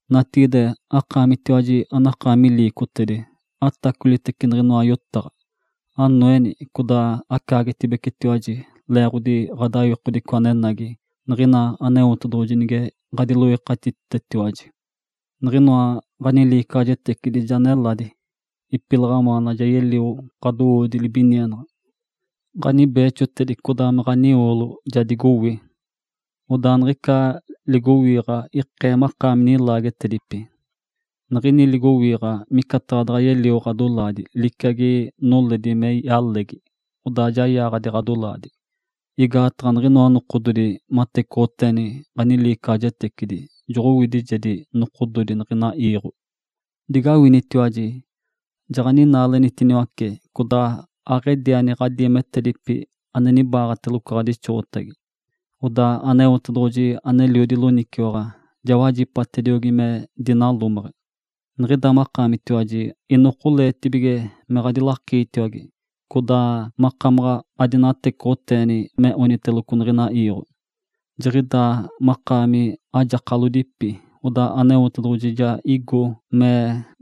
Natigide, akaamitiwaji anakaami liicotedi, atacolitece niɡ̶inoa yotaɡ̶a! Anoeni, codaa macaagetibecetiwaji leeɡ̶otedi ɡ̶adawikodico anenagi niɡ̶ina Aneotedoɡ̶oji nige ɡ̶adiloikatititetiwaji. Niɡ̶inoa ɡ̶aniliicaɡ̶ajetecidi ja neladi. Ipilaɡ̶awaana ja yelio ɡ̶adowoodi libinienaɡ̶a. Ǥanibeexo codaa me ɡ̶anioolo ja digowi. Odaa niɡ̶ica ligowiiɡ̶a ikee makaami nilaagetedipi. Niɡ̶ini ligowiiɡ̶a micataɡ̶a daɡ̶a yelio ɡ̶adoolatedi, liciagi noledi me yalegi, odaa ja yaaɡ̶adi ɡ̶adolaadi. Igaataɡ̶a niɡ̶inoa nokododi matecoɡ̶oteeni ɡ̶aniliicaɡ̶ajetecidi joɡ̶owidijedi nokododi niɡ̶ina iiɡ̶o. Digawinitiwaji! Jaɡ̶aninaalenitiniwace codaa aɡ̶ediani ɡ̶adiimetedipi ane nibaaɡ̶ateloco ɡ̶adixoɡ̶otagi. Odaa Aneotedoɡ̶oji aneliodi loniciwaɡ̶a ja wajipatediogi me dinalomeɡ̶e. Niɡ̶ida makaamitiwaji inokoleetibige me ɡ̶adilakiitiniwace, codaa makamaɡ̶a adinocaɡ̶aneɡ̶eni me oniteloco niɡ̶ina iiɡ̶o. Jiɡ̶idaa naɡ̶akaami ajakalodipi, odaa Aneotedoɡ̶oji ja igo me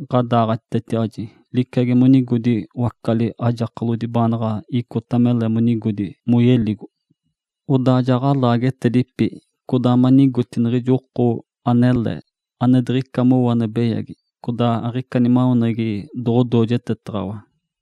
ɡ̶adaaɡ̶atitetiwaji, liciagi monigodi wacali ajakalodi baanaɡ̶a icota mele monigodi moyeligo. Odaa ja ɡ̶alaagetedipi codaa manigoti niɡ̶ijo oko anele, ane diɡ̶icata mowo ane beyagi, codaa aɡ̶ica nimaweneɡ̶egi doɡ̶odoojetetaɡ̶awa.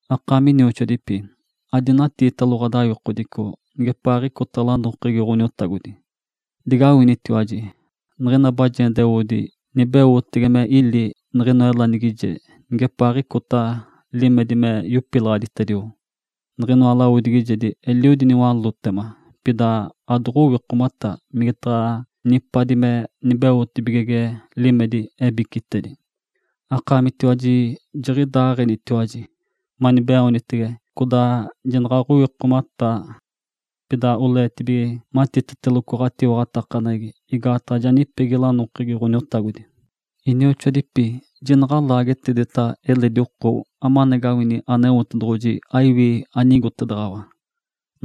Akaami inioxoadipi, adinatiitalo ɡ̶adawikodico nigepaaɡ̶icota lanokegi Ǥoniotagodi. Digawinitiwaji! Niɡ̶ina bajendeoodi nibeotege me ili niɡ̶inoa elanigijedi nigepaaɡ̶icota limedi me yopilaɡ̶aditedio. Niɡ̶inoa lawodigijedi eliodi niwalótema, pida adoɡ̶owikomata migetaɡ̶a nipadi me nibeotege limedi ebicitedi. Akaamitiwaji jiɡ̶idaaɡ̶enitiwaji, manibeoonitege codaa jinaɡ̶aɡ̶owikomataa. Pida oleetibige matiteteloco ɡ̶atiwaɡ̶atakaneɡ̶egi, igaataɡ̶a ja nipegi lanokegi Ǥoniotagodi. Inioxoadipi, jinaɡ̶a alaagetedeta eledi oko amanagawini Aneotedoɡ̶oji aiwi anigotedaɡ̶awatiwaji.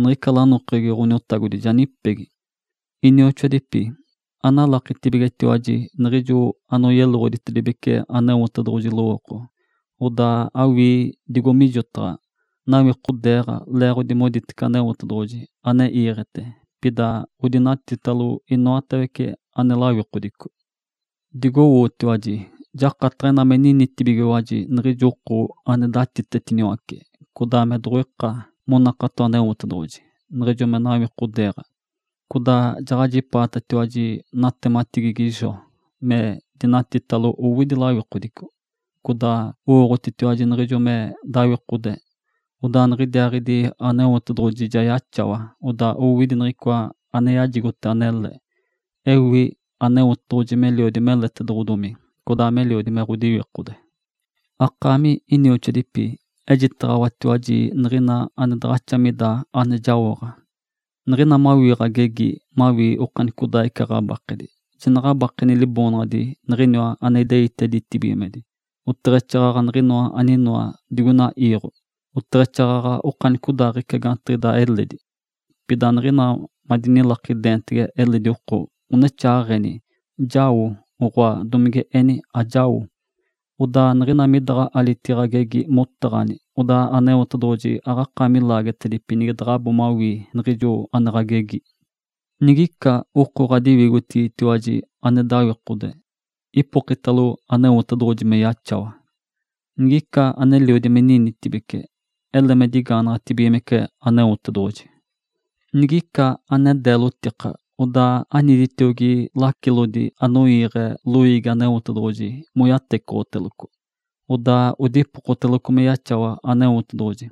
Niɡ̶ica lanokegi Ǥoniwinoɡ̶odi ja nipegi. Inioxoadipi, analakitibigetiwaji niɡ̶ijo anoyeloɡ̶oditedibece Aneotedoɡ̶oji lowooko, odaa awii digo mijotaɡ̶a. Nawikodeeɡ̶a leeɡ̶odi moditece Aneotedoɡ̶oji ane iiɡ̶ete, pida odinatitalo inoatawece ane lawikodico. Digowootiwaji! Jakataɡ̶a ina me ninitibigiwaji niɡ̶ijo oko ane datitetiniwace, codaa me doɡ̶oika monakato Aneotedoɡ̶oji, niɡ̶ijo me nawikodeeɡ̶a. Codaa jaɡ̶ajipaatatiwaji natematigigi Jó, me dinatitalo owidi lawikodico. Codaa owooɡ̶otitiwaji niɡ̶ijo me dawikode, odaa niɡ̶idiaaɡ̶idi Aneotedoɡ̶oji ja yaxawa, odaa owidi niɡ̶icoa ane yajigote anele. Ewi Aneotedoɡ̶oji meliodi meletedoɡ̶odomi, codaa meliodi me ɡ̶odiwikode. Akaami inioxoadipi, ejitaɡ̶awatiwaji niɡ̶ina ane daɡ̶axa mida ane jaoɡ̶a. Niɡ̶ina mawii ɡ̶agegi mawii okanicodaaɡ̶ica ɡ̶abakedi, jinaɡ̶abakeni liboonaɡ̶adi niɡ̶iniwa ane ideite ditibigimedi, oteɡ̶exaaɡ̶aɡ̶a niɡ̶inoa aninoa digoina iiɡ̶o, oteɡ̶exaaɡ̶aɡ̶a okanicodaaɡ̶ica gaantiɡ̶ica eledi. Pida niɡ̶ina madinilakidenitege eledi oko, onexaaɡ̶eni, “Jao!”, oɡ̶oa domige eni, “Ajao!” Odaa niɡ̶ina midaɡ̶a alitigi ɡ̶agegi motaɡ̶ani, odaa Aneotedoɡ̶oji aɡ̶akaami laagetedipi nige daɡ̶abo mawii niɡ̶ijo ane ɡ̶agegi. Nigica oko ɡ̶adiwigotigitiwaji ane dawikode, ipokitalo Aneotedoɡ̶oji me yaxawa. Nigica aneliodi me ninitibece, ele me digaanaɡ̶atibigimece Aneotedoɡ̶oji. Nigica ane deelotika, odaa aniditiogi lacilodi anoiiɡ̶e loiigi Aneotedoɡ̶oji moyatecoɡ̶oteloco, odaa odipokoteloco me yaxawa Aneotedoɡ̶oji.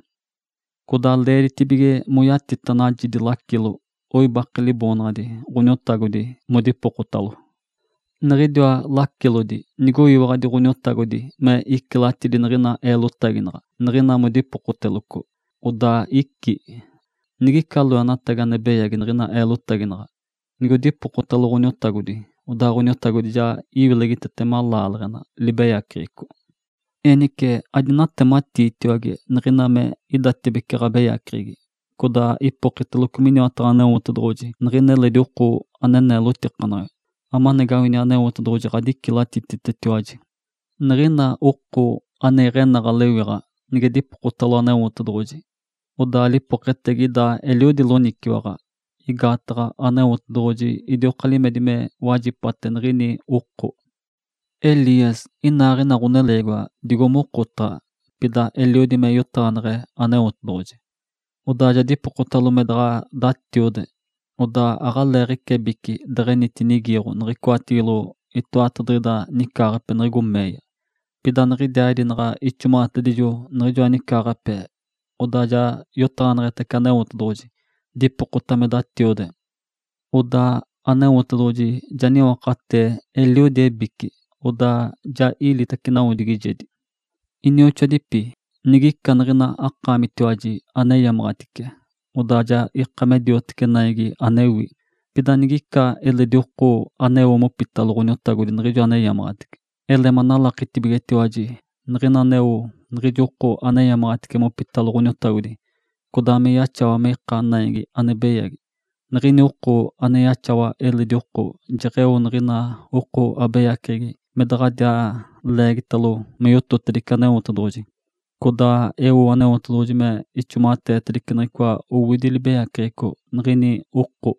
Codaa leeditibige moyatita najidi lacilo, oibake Liboonaɡ̶adi Ǥoniotagodi modipokotalo. Niɡ̶idiwa lacilodi nigoyiwaɡ̶adi Ǥoniotagodi me icilatidi niɡ̶ina eelotaginaɡ̶a niɡ̶ina modipokoteloco, odaa icí. Nigica loenatagi ane beyagi niɡ̶ina eelotaginaɡ̶a, nigodipokotalo Ǥoniotagodi, odaa Ǥoniotagodi ja iwilegitetema laaleɡ̶ena libeyaceɡ̶eco. Enice adinatematiitiwage niɡ̶ina me idatibece ɡ̶abeyaceɡ̶egi, codaa ipokiteloco miniwataɡ̶a Aneotedoɡ̶oji niɡ̶ina eledi oko ane neelotikanaɡ̶a, amanagawini Aneotedoɡ̶oji ɡ̶adicilatititetiwaji. Niɡ̶ina oko ane iɡ̶enaɡ̶a lewiɡ̶a nige dipokotalo Aneotedoɡ̶oji, odaa lipoketegi ida eliodi loniciwaɡ̶a, igaataɡ̶a Aneotedoɡ̶oji idioka limedi me wajipate niɡ̶ini oko. Elias inaaɡ̶ina ɡ̶oneleegiwa digo mokotaɡ̶a. Pida eliodi me yotaɡ̶aneɡ̶e Aneotedoɡ̶oji. Odaa ja dipokotalo me daɡ̶a datiode. Odaa aɡ̶aleeɡ̶ica ebici deɡ̶enitinigiiɡ̶o niɡ̶icoatigilo itoatadiɡ̶ida nicaaɡ̶ape niɡ̶igo meeya. Pida niɡ̶idiaaɡ̶idi naɡ̶a ixomaɡ̶atedijo niɡ̶ijoa nicaaɡ̶ape, odaa ja yotaɡ̶aneɡ̶etace Aneotedoɡ̶oji, dipokota me datiode. Odaa Aneotedoɡ̶oji ja niwakatee eliodi ebici, odaa ja ilitace nawodigijedi. Inioxoadipi, nigica niɡ̶ina akaamitiwaji aneyamaɡ̶atice, odaa ja ika me dioteci naigi anewi, pida nigica eledi oko aneo mopitalo Ǥoniotagodi niɡ̶ijo aneyamaɡ̶atice, ele manalakitibigetiwaji, niɡ̶ina aneo niɡ̶ijo aneyamaɡ̶atice mopitalo Ǥoniotagodi, codaa me yaxawa me ika naigi ane beyagi, niɡ̶ini oko ane yaxawa eledi oko jeɡ̶eo niɡ̶ina oko abeyaceɡ̶egi me daɡ̶adiaa leegitalo me yototedice Aneotedoɡ̶oji, codaa eo Aneotedoɡ̶oji me ixomaɡ̶ateetedice niɡ̶icoa anowidi libeyaceɡ̶eco niɡ̶ini oko.